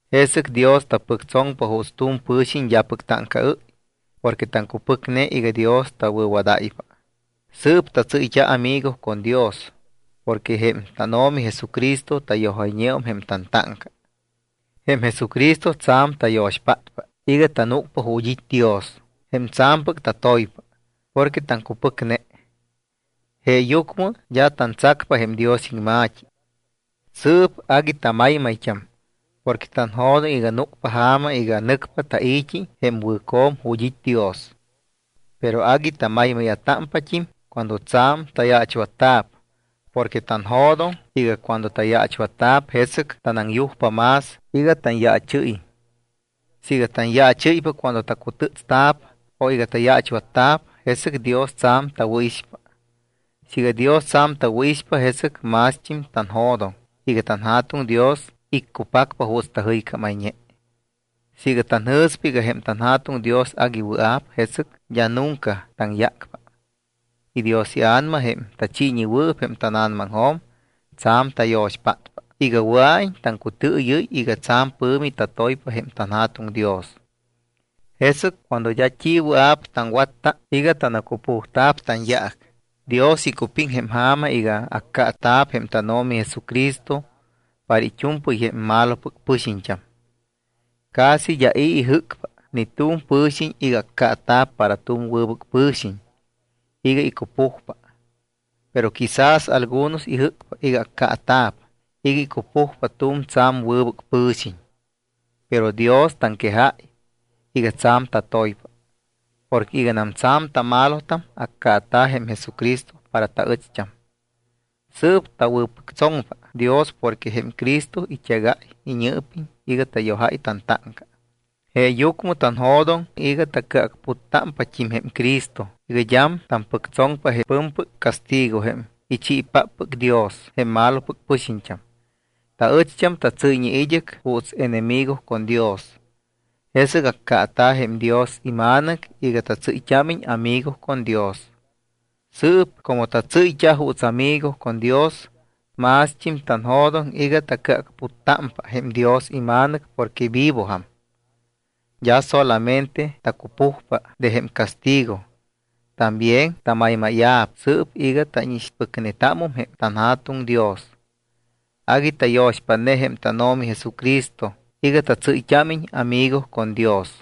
Jesɨc Dios tapɨctsoŋpa juuts tu̱m pɨ̱xiñ d́apɨc táŋcaɨ́y porque taŋcupɨcne iga Dios tawɨ̱wadáypa. Sɨɨp tatsɨ́yt́a amigo con Dios porque jém tánO̱mi Jesucristo tayojayñeum jém tantáŋca. Jém Jesucristo tsa̱m tayo̱xpátpa iga tanúcpa ju̱t́ it́ Dios, jém tsa̱mpɨc tatoypa, porque taŋcupɨcne. Jeeyucmɨ d́a tantsacpa jém Dios iŋma̱t́i. Sɨɨp agui tamaymayt́am porque tanjo̱doŋ iga núcpa ja̱ma iga nɨcpa tai̱t́i jém wɨ̱co̱m ju̱t́ it́ Dios. Pero agui tamaymáya̱támpat́im cuando tsa̱m tayaachwatta̱p porque tanjo̱doŋ iga cuando tayaachwatta̱p, jesɨc tanaŋyujpa más iga tanyaachɨ́yiñ. Siiga tanyaachɨ́ypa cuando tacutɨ́tsta̱p o iga tayaachwatta̱p, jesɨc Dios tsa̱m tawɨ̱ixpa. Siiga Dios tsa̱m tawɨ̱ixpa, jesɨc mást́im tanjo̱doŋ iga tanJa̱tuŋ Dios iccupacpa juuts tajɨycámayñe. Siiga tanjɨ̱spa iga jém tanJa̱tuŋ Dios agui wɨa̱p, jesɨc d́a nunca taŋyácpa; y Dios iA̱nama, jém tachiiñewɨɨp jém tána̱namaŋjo̱m, tsa̱m tayo̱xpátpa iga wɨa̱iñ taŋcutɨɨyɨ́y iga tsa̱m pɨ̱mi tatoypa jém tanJa̱tuŋ Dios. Jesɨc cuando d́a t́i wɨa̱p taŋwatta iga tanacupujta̱p tanyaac, Dios icupiŋ jém ja̱ma iga accaata̱p jém tánO̱mi Jesucristo para it́u̱mpɨy jém malopɨc pɨxiñt́am. Casi d́a i̱ ijɨ́cpa ni tu̱m pɨ̱xiñ iga accaata̱p para tu̱m wɨbɨc pɨ̱xiñ iga icupujpa. Pero quizás algunos ijɨ́cpa iga accaata̱p iga icupujpa tu̱m tsa̱m wɨbɨc pɨ̱xiñ. Pero Dios taŋquejáy iga tsa̱m tatoypa. Porque iganam tsa̱m tamalotam, accaata̱ jém Jesucristo para taɨcht́am. Sɨɨp tawɨ̱pɨctsoŋpa Dios porque jém Cristo it́egáy iñɨɨpiñ iga tayojáy tantáŋca. Jeeyucmɨ tanjo̱doŋ iga tacɨacputtámpat́im jém Cristo iga d́am tampɨctsoŋpa jém pɨ̱mpɨc castigo jém ichiipáppɨc Dios jém malopɨc pɨxiñt́am. Taɨcht́am tatsɨ́yñe id́ɨc juuts enemigo con Dios. Jesɨc accaata̱ jém Dios iMa̱nɨc iga tatsɨ́yt́ámiñ amigo con Dios. Sɨɨp como tatsɨ́yt́a juuts amigo con Dios, mást́im tanjo̱doŋ iga tacɨacputtámpa jém Dios iMa̱nɨc porque vivojam. D́a solamente tacupujpa de jém castigo, también tamaymáya̱p sɨɨp iga tánixpɨcnetámum jém tanJa̱tuŋ Dios. Agui tayo̱xpátne jém tánO̱mi Jesucristo iga tatsɨ́yt́ámiñ amigo con Dios.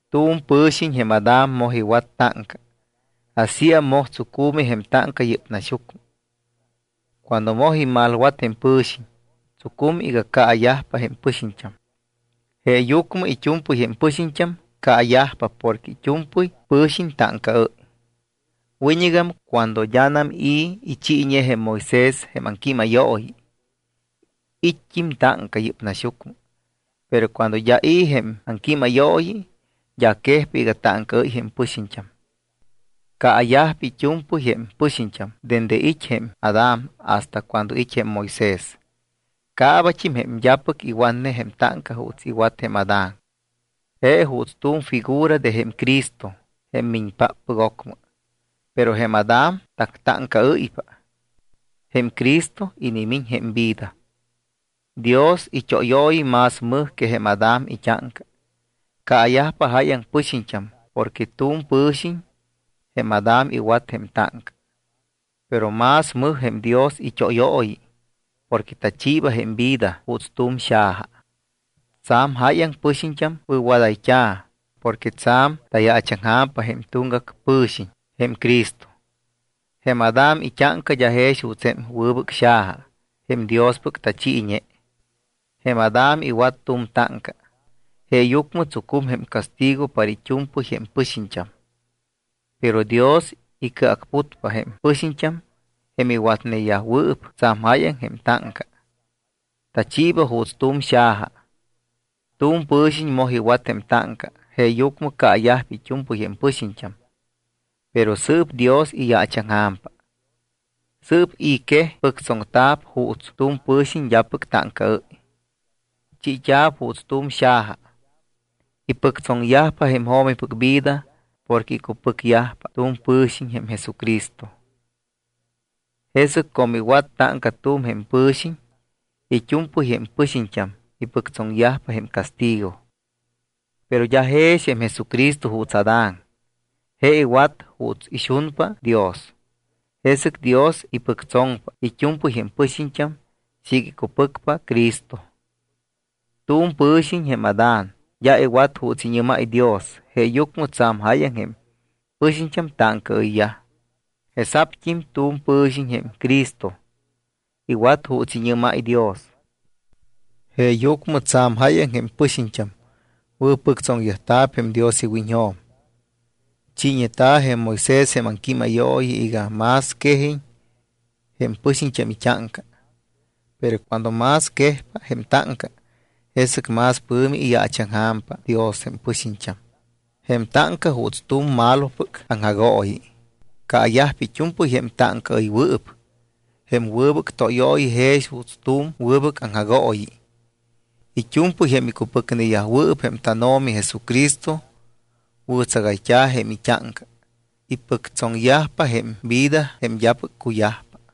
Tu̱m pɨ̱xiñ jém Adán moj iwat táŋca. Asíam moj tsucu̱mi jém táŋca yɨ́p naxyucmɨ. Cuando moj imalwat jém pɨ̱xiñ, tsucum iga caayajpa jém pɨxiñt́am. Jeeyucmɨ it́u̱mpɨy jém pɨxiñt́am caayajpa porque it́u̱mpɨy pɨ̱xiñ táŋcaɨ́y. Wiñɨgam cuando d́anam i̱ ichiiñe jém Moisés jém aŋquímayooyi, it́t́im táŋca yɨ́p naxyucmɨ. Pero cuando d́a i̱ jém aŋquímayooyi, d́a quejpa iga táŋcaɨ́y jém pɨxiñt́am. Caayajpa it́u̱mpɨy jém pɨxiñt́am dende it́ jém Adán hasta cuando it́ jém Moisés. Caabat́im jém d́apɨc iwatne jém táŋca juuts iwat jém Adán. Je juuts tu̱m figura de jém Cristo, jém miñpáppɨc ocmɨ. Pero jém Adán tactáŋcaɨ́ypa, jém Cristo inimiñ jém vida. Dios it́óyooyi más mɨj que jém Adán it́áŋca. Caayajpa jáyaŋ pɨxiñt́am porque tu̱m pɨ̱xiñ, jém Adán, iwat jém táŋca. Pero más mɨj jém Dios it́óyooyi porque tachiiba jém vida juuts tu̱m xaja. Tsa̱m jáyaŋ pɨxiñt́am wɨ̱wadayt́a̱ porque tsa̱m tayaachaŋja̱mpa jém tuŋgac pɨ̱xiñ, jém Cristo. Jém Adán it́áŋca d́a jex juuts jém wɨbɨc xaja jém Diospɨc tachiiñe. Jém Adán iwat tu̱m táŋca, jeeyucmɨ tsucum jém castigo para it́u̱mpɨy jém pɨxiñt́am. Pero Dios icɨacputpa jém pɨxiñt́am jém iwatneyajwɨɨp tsa̱m jáyaŋ jém táŋca. Tachiiba juuts tu̱m xaja. Tu̱m pɨ̱xiñ moj iwat jém táŋca, jeeyucmɨ caayajpa it́u̱mpɨy jém pɨxiñt́am, pero sɨɨp Dios iyaachaŋja̱mpa. Sɨɨp i̱ quej pɨctsoŋta̱p juuts tu̱m pɨ̱xiñ d́apɨc táŋcaɨ́y. Chiit́a̱p juuts tu̱m xaja, ipɨctsoŋyajpa jém jo̱mipɨc vida porque icupɨcyajpa tu̱m pɨ̱xiñ, jém Jesucristo. Jesɨc como iwat táŋca tu̱m jém pɨ̱xiñ, it́u̱mpɨy jém pɨxiñt́am ipɨctsoŋyajpa jém castigo. Pero d́a jex jém Jesucristo juuts Adán. Je iwat juuts ixunpa Dios, jesɨc Dios ipɨctsoŋpa it́u̱mpɨy jém pɨxiñt́am siiga icupɨcpa Cristo. Tu̱m pɨ̱xiñ jém Adán d́a iwat juuts iñɨ́máy Dios. Jeeyucmɨ tsa̱m jáyaŋ jém pɨxiñt́am táŋcaɨyyaj. Jesa̱pt́im tu̱m pɨ̱xiñ jém Cristo iwat juuts iñɨ́máy Dios. Jeeyucmɨ tsa̱m jáyaŋ jém pɨxiñt́am wɨ̱pɨctsoŋyajta̱p jém Dios iwiñjo̱m. Chiiñeta̱ jém Moisés jém aŋquímayooyi iga más quejiñ jém pɨxiñt́am it́áŋca. Pero cuando más quejpa jém táŋca, jesɨc más pɨ̱mi iyaachaŋja̱mpa Dios jém pɨxiñt́am. Jém táŋca juuts tu̱m malopɨc aŋjagooyi. Caayajpa it́u̱mpɨy jém táŋcaɨywɨɨp. Jém wɨbɨc tóyooyi jex juuts tu̱m wɨbɨc aŋjagooyi. It́u̱mpɨy jém icupɨcneyajwɨɨp jém tánO̱mi Jesucristo wɨ̱tsagayt́a̱ jém it́áŋca. Ipɨctsoŋyajpa jém vida jém d́apɨc cuyajpa.